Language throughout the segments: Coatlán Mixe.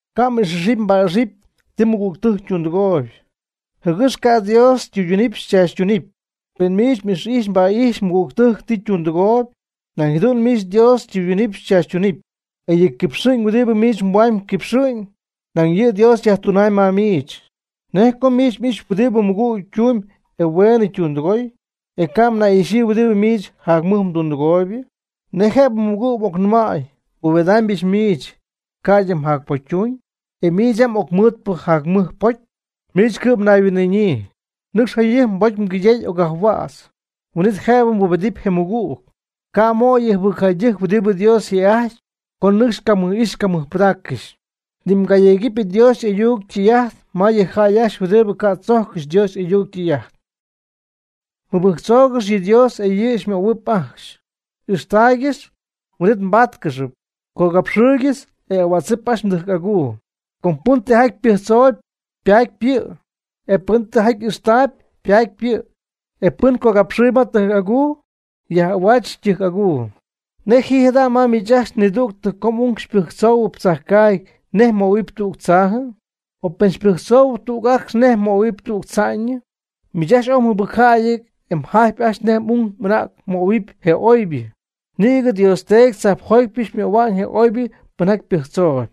Ca' m'ix'ijxpy mba'ijxpy ti mmɨgügtɨjc ytundɨgooyb, jɨgɨx ca' Dios xytɨydunɨpy chaachytunɨpy. Pen miich m'ix'ijxpy mba'ijxpy mmɨgügtɨjc ti ytundɨgooyb, nañ jadu'n miich Dios xytɨydunɨpy xychaachytunɨpy, e yɨ quipxɨ'ñ huɨdibɨ miich mhuamyb quipxɨ'ñ, nañ yɨ' Dios yajtunamyb ma miich. ¿Nej co miich m'ixy huɨdibɨ mmɨgüg ytumyb e hueenɨ ytundɨgooyb, e ca' mnay'ixyii huɨdibɨ miich jac mɨj mdundɨgooybɨ? ¿Nej jëbɨ mmɨgüg m'ocnɨmäy: “Nbubedamybɨch miich ca'ydɨ mjacpocytuñ”, e miich yam m'ocmɨɨdpɨ jac mɨj pocy? Miich cɨ'm mnayhuin'ɨɨñyii. Nɨcx jayɨjp mbocy mgaydey ocyajhuädz, huin'it jëbɨ mbubety je mmɨgüg. Ca' mmöy yɨ jɨbɨcjäydɨjc huɨdibɨ Dios yjë'ajty co nɨcx camɨj'ijx camɨjpɨdaaccɨxy; ni mgayegɨpy Dios y'ayuc ytɨy'ajt ma yɨ jäy ajcxy huɨdibɨ ca' tzojccɨxy Dios y'ayuc ytɨy'ajt. Mɨbɨjctzougɨx yɨ Dios e yɨ' xymöhuɨpy ajcxy; ixtaaygɨx, huin'it mbáatcɨxɨpy; cogapxɨɨygɨx e ahuädzɨp ajcxy mdɨjc aguu. Com pɨn tijaty pɨjctzoob ypaatyp yɨ'; e pɨn tijaty ixtaayb ypaatyp yɨ'; e pɨn cogapxɨɨyb ma tɨjc aguu, yaj'ahuaatzɨp ytɨjc aguu. ¿Nej ji jada' miich ajcxy nidügtɨ co m'ung pɨjtzoohuɨpy tzajcaagy nej mmöhuɨpy tüg tzaajɨ? ¿O pen ypɨjctzooby tüg acx nej mmöhuɨpy tüg tza'ñɨ? Miich ajcxy oy mjɨbɨcjäyɨty e mjajtpy ajcxy nej m'ung m'anäg mmöhuɨpy je oybɨ. ¡Nïgɨ Dios Teedy tzajpjotypɨ möhua'ñ je oybɨ pɨnjaty pɨjctzoob!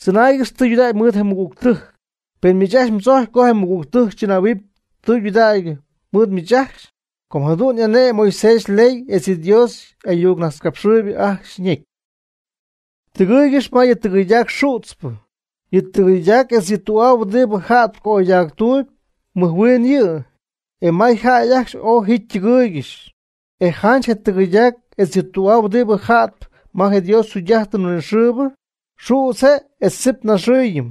Tzɨnaaygɨx tɨydudägy mɨɨd je mmɨgügtɨjc, pen miich ajcxy mdzojcpy co je mmɨgügtɨjc chɨnähuɨpy tudägy mɨɨd miich ajcxy; com jadu'n y'ane'my Moisés yley etz yɨ Dios y'ayuc najtzcapxɨɨyb ajcxy ñecy. Tɨgɨɨygɨx ma yɨ tɨgɨyɨɨydac xützpɨ: yɨ tɨgɨyɨɨydac etz yɨ tü'aa huɨdibɨ ja'tp ca'oydactuuby mɨj huin yɨ', e may jäy ajcxy oy ji ytɨgɨyɨɨygɨxy. E janch je tɨgɨyɨydac etz yɨ tü'aa huɨdibɨ ja'tp ma je jugy'ajtɨn huinɨxɨɨbɨ, xüdz je' etz tzip naxɨɨyñɨ;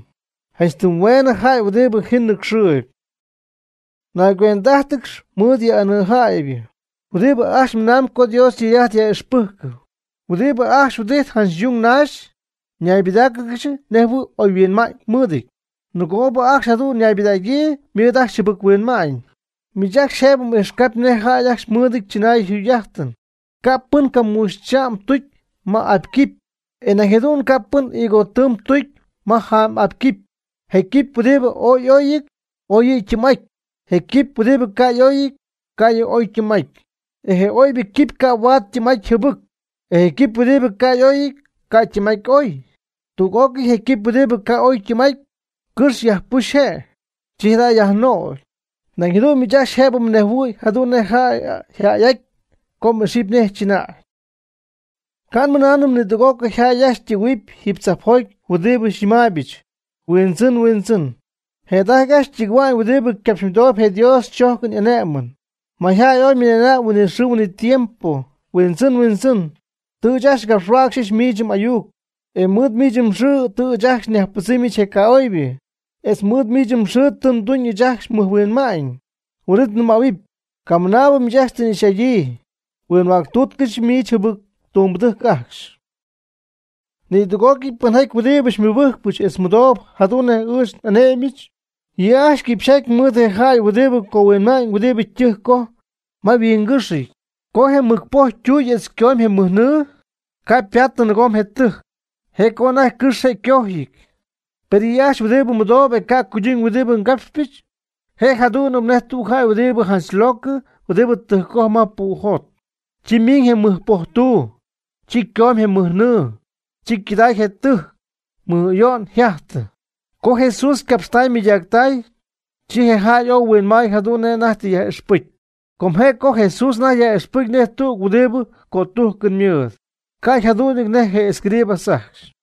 janch tɨm hueenɨ jäy huɨdibɨ ji nɨcxɨɨyb. Nayguend'ájtɨgɨx mɨɨd yɨ jäy anɨɨjatypɨ huɨdibɨ ajcxy mɨnamb co Dios ytɨy'ajt yaj'ixpɨjcp, huɨdibɨ ajcxy huɨdijtp janch yung janch naxy ñaybɨdaaccɨxy nejɨhuɨ̈y ooy oy huinma'ñ mɨɨdɨty; nɨgoobɨ ajcxy jadu'n ñaybɨdägyii, ymɨɨd ajcxy jɨbɨc-huinma'ñ. Miich ajcxy jëbɨ m'ijxcapy nejjaty ajcxy mɨɨdɨty chɨnaayɨn yjugy'ajtɨn; ca' pɨn caamuxy cha'm tucy ma apy quipy, e nañ jadu'n ca' pɨn higo tɨɨm tucy ma jaam'apy quipy. Je quipy huɨdibɨ ooy y'oyɨty, oy yɨ' ytɨɨm'aty. Je quipy huɨdibɨ ca' y'oyɨty, ca' yɨ' oy ytɨɨm'aty. E je oybɨ quipy ca' huaad ytɨɨm'aty jɨbɨc. E je quipy huɨdibɨ ca' y'oyɨty ca' ytɨɨm'aty oy. Tüg'ócɨy je quipy huɨdi ca' oy ytɨɨm'aty, cɨxy yajpujxp je'. Chi jada' yajnögy. Nañ jadu'n miich ajcxy jëbɨ mnejhuɨ̈y jadu'n nej jäy yjäy'aty co m'ixɨpy nej chɨnäy. Ca' nmɨnaanɨm nidüg'ócɨy jäy ajcxy ytɨgɨ̈huɨpy jiiby tzajpjoty huɨdibɨ xyñɨmaaybɨch: “Huindzɨn, Huindzɨn”, jëda'ajty ajcxy tɨgɨ̈huamb huɨdibɨ ycapxymɨdooyb je Dios chojcɨn y'ane'mɨn. Mayjäy oy mɨna'na'ñ huin'it xɨɨ huin'it tiempo: “Huindzɨn, Huindzɨn”, tɨ ɨɨch ajcxy ngapxhuäcxy miich m'ayuc, e mɨɨd miich mxɨɨ tɨ ɨɨch ajcxy nyajpɨdzɨmy je ca'oybɨ; etz mɨɨd miich mxɨɨ tɨ nduñ ɨɨch ajcxy mɨj huinma'ñ. Huin'it nɨmähuɨpy: “Camɨnaabɨ miich ajcxy tɨ nga'ixy'adyii; huinhuäctutcɨch miich jɨbɨc tumbɨdɨjc ajcxy.” Nidüg'ócɨy pɨnjäy huɨdibɨ xymɨbɨjcpɨch etz mɨdooyb jadu'n nej ɨɨch n'ane'myɨch yɨ' ajcxy quipxyjaty mɨɨd je jäy huɨdibɨ cohuinma'ñ huɨdibɨ ytɨjc ycojp ma yhuingɨ́xɨty. Co ymɨcpojtüy etz ycomy je mɨj nɨɨ, ca' ypadyii nɨɨgom je tɨjc, je' co anajty cɨxy je' ycojyɨty. Per yɨ' ajcxy huɨdibɨ mɨdoob e ca' cuyduñ huɨdibɨ ngapxpɨch, je' jadu'nɨp nej tüg jäy huɨdi janch locɨ huɨdi ytɨjccoj ma pu' jot. Co ymiñ je mɨc poj tuu, chi ycomy je mɨj nɨɨ. Chi ycɨday je ytɨjc; mɨj ayo'n oy yjajtɨ. Co Jesús ycapxtay ymɨydactay, chi je jäy ooy huinmay jadu'n nej anajty tɨ yaj'ixpɨcy. Com je' co Jesús anajty yaj'ixpɨcy nej tüg huɨdibɨ cötujcɨn mɨɨd, ca' yjadu'nɨty nej je escribas ajcxy.